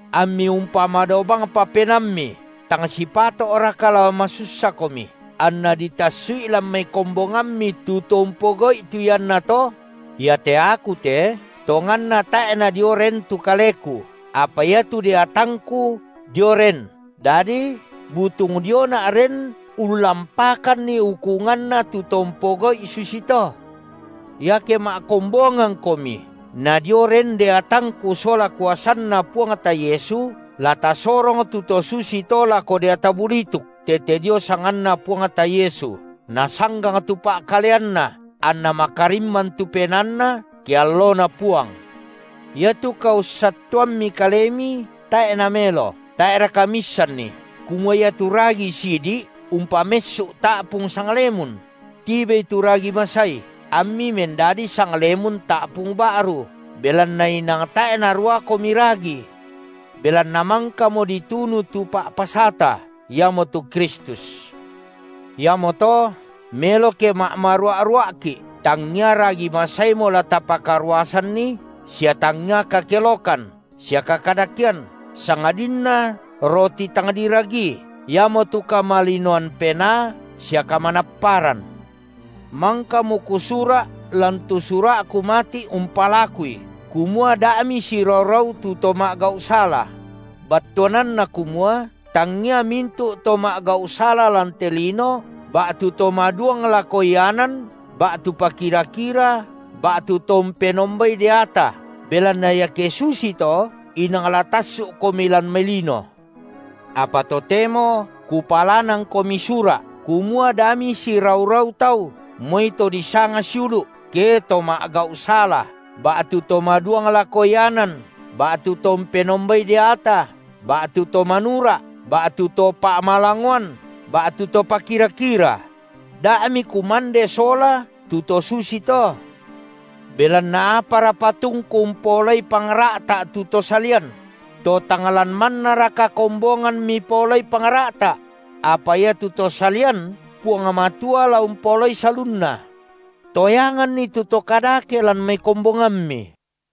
Ammi umpamadao bangpa penaammi, tang sipato’raka la masussakomi, anna ditassu’i lan mai kombongammi tu to umpogau’i tu iannato? Iate aku te, tonganna tae’ nadio ren tu kaleku, apa iatu deatangku dio ren, dadi butung diona’ ren ullampakanni ukunganna tu to umpogau’i susito. Iake ma’kombongangkomi nadio ren deatangku sola kuasanNa Puangta Yesu, la tasorong tu to susito lako deata bulituk tete dio sanganNa Puangta Yesu, nasanggang tu pa’kaleanna, anna makarimman tu penaanna, ke alloNa Puang. Iatu kaussattuammi kalemi tae’ namelo. Tae’raka miissanni kumua iatu ragi sidi’ umpamessu’ ta’pung sanglemun? Tibei tu ragi masai, ammi mendadi sanglemun ta’pung ba’ru, belanna inang tae’ naraukomi ragi. Belanna mangkamo ditunu tu pa’pasata, iamotu Kristus. Iamoto melo ke ma’marua’-rua’ki’, tangia ragi masaimo la tapakaruasanni, sia tangia kakelokan sia kakadakean, sangadinna roti tang diragii, iamotu kamalinoan penaa sia kamanapparan. Mangkamo kusura’ lan tu sura’ku mati’ umpalakui kumua da’ misirau-rau tu to ma’gau’ sala; battuananna kumua: tangia mintu’ to ma’gau’ sala lan te lino, ba’tu to maduang lako ianan, ba’tu pakira-kira, ba’tu to umpenombai deata; belanna iake susito inang la tassu’komi lan mai lino. Apa totemo kupalanangkomi sura’ kumua da misirau-rau tau, moi to disanga siulu’, ke to ma’gau’ sala ba’tu to maduang lako ianan, ba’tu to umpenombai deata, ba’tu to manura’, ba’tu to pa’malangoan ba’tu to pakira-kira: da’ mikumande sola tu to susito. Belanna apara patungku umpaolai pangra’ta’ tu to salian? To tang lan mannaraka kombongan mipaolai pangra’ta’? Apa iatu to salian Puang Matua la umpaolai salunna. Toyanganni tu to kadake lan mai kombongammi.